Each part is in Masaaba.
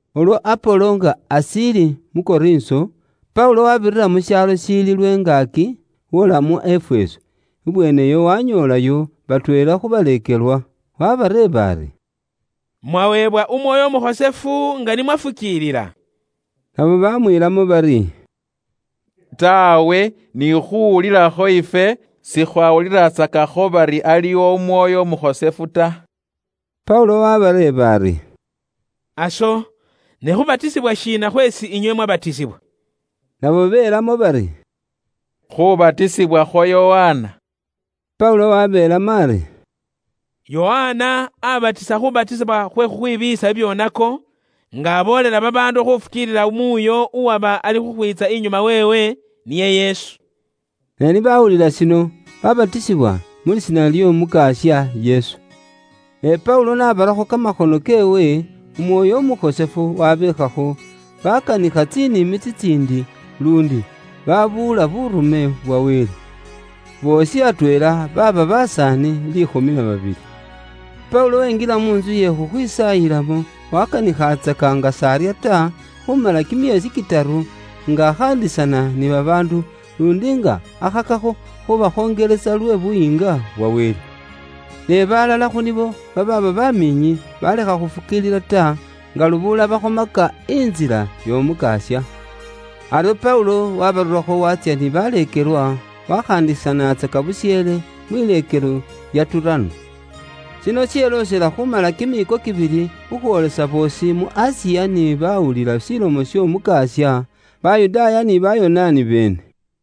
Ulwo Apolo nga ashiili mu Korinso, Paulo waabirira mu shaalo shiili lwengaaki, woola mu Efeso, ibweeneyo wanyoolayo batweela khu baleekelwa. Waabareeba ari, “Mwaweebwa Umwoyo Umukhosefu, nga ni mwafukiilila?” Nabo baamwiilamo bari, “Taawe, ni khuuwulilakho ifwe sikhwawulilatsakakho bari aliwo Umwoyo Umukhosefu ta.” Paulo waabareeba ari, “Aso, ne khubatisibwa shiina khweesi inywe mwabatisibwa?” Nabo belamo bari, “Khubatisibwa khwa Yokana.” Paulo wabeelamo ari, “Yokana aabatisa khuubatisibwa khwe khukhwibiiyisa bibyoonako, nga aboolela babaandu khufukiilila muuyo uwaba alikhukhwiitsa inyuma weewe, niye Yesu.” Ne ni baawulila shino, baabatisibwa mu lisiina ly'Omukasya Yesu. Ne Paulo n'abarakho kamakhono keewe, Umwoyo Umukhosefu wabeekhakho, baakanikha tsinimi tsitsiindi, naluundi baakhola buŋoosi mu lisina lya Wele. Boosi atweela baaba basaani liikhumi na babili. Paulo wenjila mu ntsu iye khukhwisaayilamo, waakanikhatsaka nga s'arya ta, khuumala kimyeesi kitaru, nga akhaandisana ni babaandu, luundi nga akhakakho khubakhonjelesa lwe Buyiinga bwa Wele. Ne balala khu nibo, babaaba bamiinyi, balekha khufukiilila ta, nga lubuula bakhomaka Intsila y'Omukasya. Aryo Paulo wabarurakho watsya ni baleekelwa, wakhandisanaatsaka busheele mwileekelo lya Turano. Shino sheloosela khuumala kimiiko kibili, khukhwoolesa boosi mu Asiya ni baawulila Ilomo y'Omukasya: Bayudaaya ni Bayonaani beene.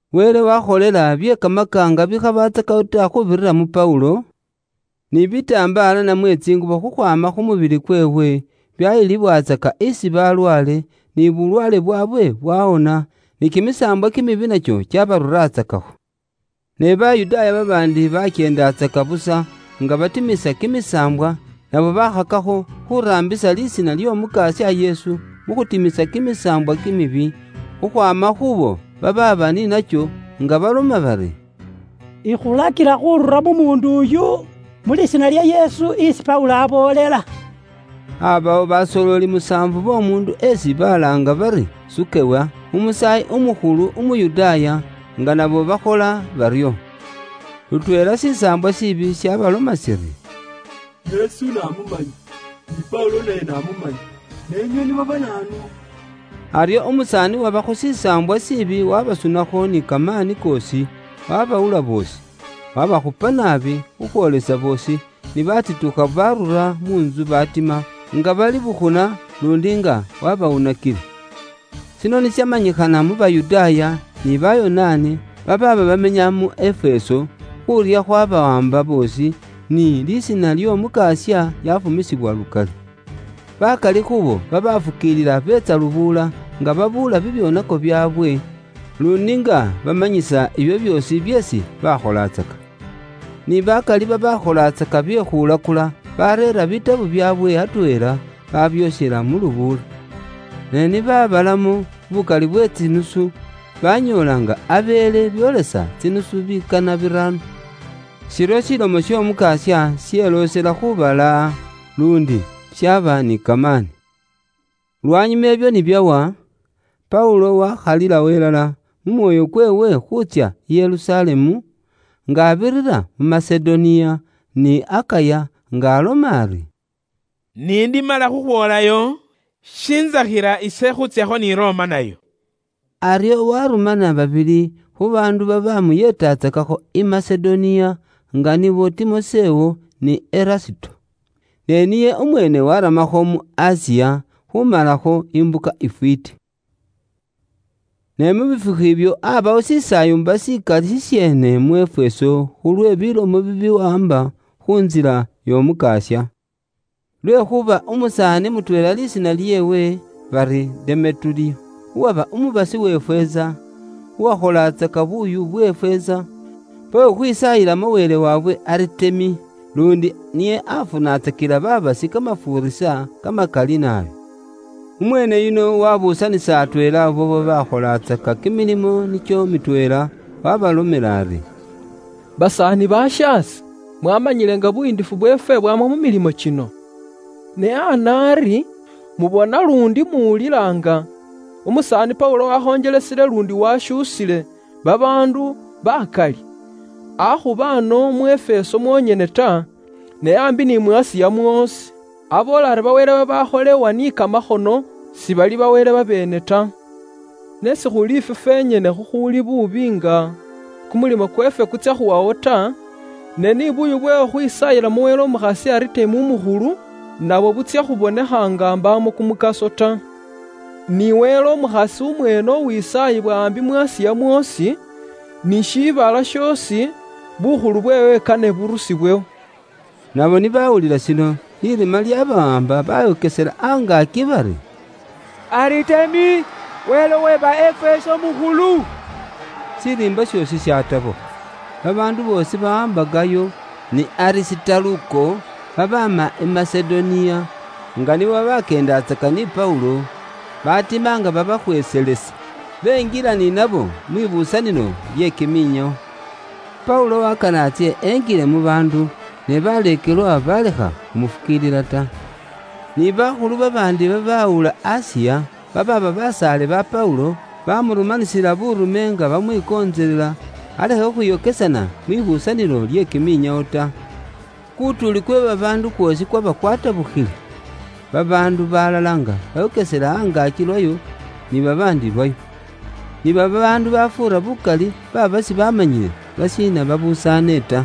Wele waakholela bye kamakaanga bikhabatsakawo ta khuubirira mu Paulo, ni bitambaala namwe tsingubo khukhwaama khu mubili kweewe, byayilibwatsaka isi balwaale, byabawonesa, ni kimisaambwa kimibi nakyo kyabaruratsakakho. Ne Bayudaaya babaandi babakyeendatsaka busa nga batimisa kimisaambwa, nabo bakhakakho khuraambisa lisiina ly'Omukasya Yesu, mu khutimisa kimisaambwa kimibi khukhwaama khuubo babaaba ni nakyo, nga baloma bari, “Ikhulakila khurura mu muundu uyu, mu lisiina lya Yesu isi Paulo aboolela.” Aabawo basooleli musaafu b'omuundu esi balaanga bari Sukewa, umusaayi umukhulu Umuyudaaya, nga nabo bakhola baryo. Lutweela shisaambwa shiibi shabaloma shiri, “Yesu namumanya, ni Paulo naye namumanya, ne inywe nibo ba naanu?” Aryo umusaani uwabakho shisaambwa shiibi wabasunakho ni kamaani koosi, wabawula boosi. Wabakhupa naabi khukhwoolesa boosi ni batitukha barura mu ntsu batima, nga bali bukhuna, luundi nga wabawunakile. Shino ni shamanyikhana mu Bayudaaya, ni Bayonaani, babaaba bamenya mu Efeso, khuurya khwabawaamba boosi, ni lisiina ly'Omukasya lyafumisibwa lukali. Bakali khuubo babafukiilila beetsa lubuula, nga babuula bibyoonako byaabwe, luundi nga bamanyisa ibyo byoosi byeesi bakholatsaka. Ni bakali babaakholatsaka bye khulakula, bareera buurone bwaabwe atweela, babyokhela mu lubuula. Ne ni baabalamo bukali bwe tsinusu, banyoola nga abeele byoolesa tsinusu bikana biraano. Iryo Ilomo y'Omukasya yeloosela khuubalaaha, luundi yaaba ni kamaani. Lwanyuma ibyo ni byawa, Paulo waakhalilawo ilala mu mwoyo kweewe khuutsya i Yerusalemu, nga abirira mu Masedoniya ni Akaya nga aloma ari, “Ni ndimala khukhwoolayo, shintsakhila ise khuutsyakho ni Roma nayo.” Aryo warumana babili khu baandu babamuyeetatsakakho i Masedoniya, nga nibo Timosewo, ni Erasto. Ne niye umweene waramakho mu Asiya, khumalakho imbuka ifwiiti. Ne mu bifukhu ibyo, aabawo shisaayumba shikali shisheene mu Efeso khulwe bilomo bibiwaamba khu Ntsila y'Omukasya. Lwekhuuba umusaani mutweela lisiina lyeewe Demeturiyo, uwaba umubasi we feeza, uwakholatsaka buuyu bwe feeza, bwe khukhwisaayilamo wele waabwe Aritemi, luundi niye afunatsakila babasi kamafuurisa kamakali naabi. Umweene yuno waabuusanisa atweela abo babaakholatsaka kimilimo nikyo mitweela, waabalomela ari, “Basaani bashaase, mwaamanyile nga buyiindifu bweefwe bwaama mu milimo kino. Ne ana ari, mubona luundi muwulila nga umusaani Paulo wakhonjelesile luundi washuusile babaandu bakali, akhuba ano mu Efeso mwonyene ta, ne aambi ni mu Asiya mwoosi. Aboola ari ba wele babaakholewa ni kamakhono, sibali ba wele babeene ta. Ne sikhuli ifwe fwenyene khukhuuli buubi nga kumulimo kweefwe kutsya khuwawo ta, ne ni buuyu bwe khukhwisaayilamo wele umukhasi Aritemi umukhulu nabwo butsya khubonekha nga mbaamo kumukaso ta. Ni wele umukhasi umweene uwisaayibwa ambi mu Asiya mwoosi, ni shiibala shoosi, bukhulu bweewe kane burusibwewo.” Nabo ni bawulila shino, lirima lyabawaamba, bayokesela angaaki bari, “Aritemi, wele uwe ba Efeso mukhulu.” Shiriimba shoosi shatabukha. Babaandu boosi bawaamba Gayo, ni Arisitaluko babaama i Masedoniya nga nibo babakyeendatsaka ni Paulo, batima nga babaakhweeselesa, benjila ni nabo mwibusanilo lye kiminyawo. Paulo wakana atsye injile mu baandu, ne baleekelwa balekha khumufukiilila ta. Ni bakhulu babaandi babawula Asiya, babaaba basaale ba Paulo, baamurumanisila buurume nga bamwikontselela, alekhe khukhwiyokesana mwibuusanilo lye kiminyawo ta. Kutuuli kwe babaandu kwoosi kwaba kwatabukhile. Babaandu balala nga bayokesela angaaki lwayo, ni babaandi lwayo. Ni babaandu babafuura bukali baaba sibamanyile lwashiina babusaane ta.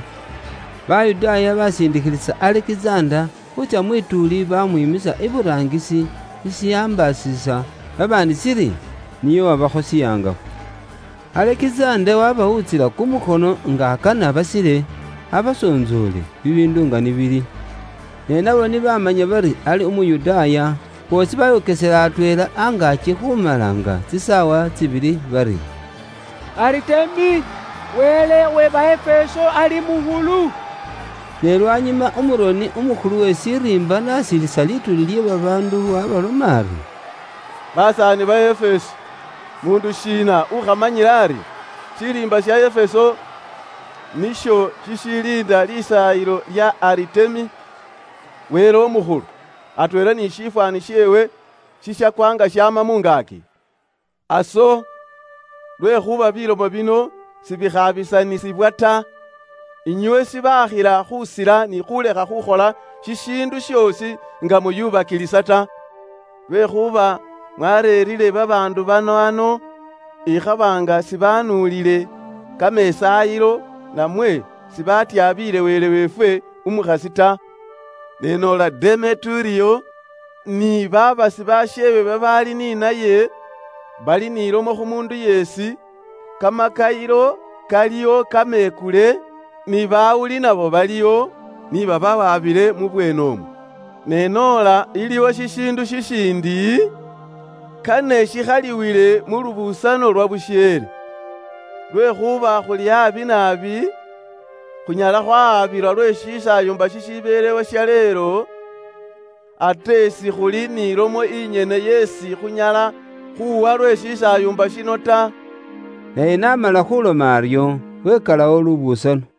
Bayudaaya basindikhilisa Alekizanda, khuutsya mwituuli, bamwiimisa iburaangisi, shishambaasisa babaandi shiri niye uwabakho shihangafu. Alekizanda wabawutsila kumukhono nga akana basile, abasontsoole bibiindu nga ni bili. Ne nabo ni bamumanya bari ali Umuyudaaya, boosi bayokesela atweela angaaki khumala nga tsisaawa tsibili bari, “Aritemi, wele uwe ba Efeso ali mukhulu.” Ne lwanyuma umuroni umukhulu uwe shiriimba n'asilisa lituuli lye babaandu waabaloma ari, “Basaani ba Efeso, muundu shiina ukhamanyile ari, shiriimba sha Efeso nisho shishiliinda lisaayilo lya Aritemi, wele umukhulu, atweela ni shifwaani sheewe shishakwa nga shaama mu ngaaki? Aso, lwekhuuba bilomo bino sibikhabisanisibwa ta, inywe shibakhila khusila ni khulekha khukhola shishiindu shoosi nga muyubakilisa ta. Lwekhuuba mwareerire babaandu bano ano, ikhaba nga sibanuulile kamesaayilo namwe sibafwotsoole wele weefwe umukhasi ta. Ne noola Demeturiyo ni babasi basheewe babaali ni naye, bali ni lomo khu muundu yeesi, kamakayilo kaliwo kamekule, ni bawuli nabo baliwo, ni babawabile mu bweenemwo. Ne noola iliwo shishiindu shishindi, kane shikhaliwile mu lubusano lwabusheele. Lwekhuuba khuli abi naabi, khunyala khwawabilwa lwe shisaayumba shishibelewo shaleelo, ate sikhuli ni lomo inyene yeesi khunyala khuuwa lwe shisaayumba shino ta.” Naye n'amala khuloma aryo, wekalawo lubusano.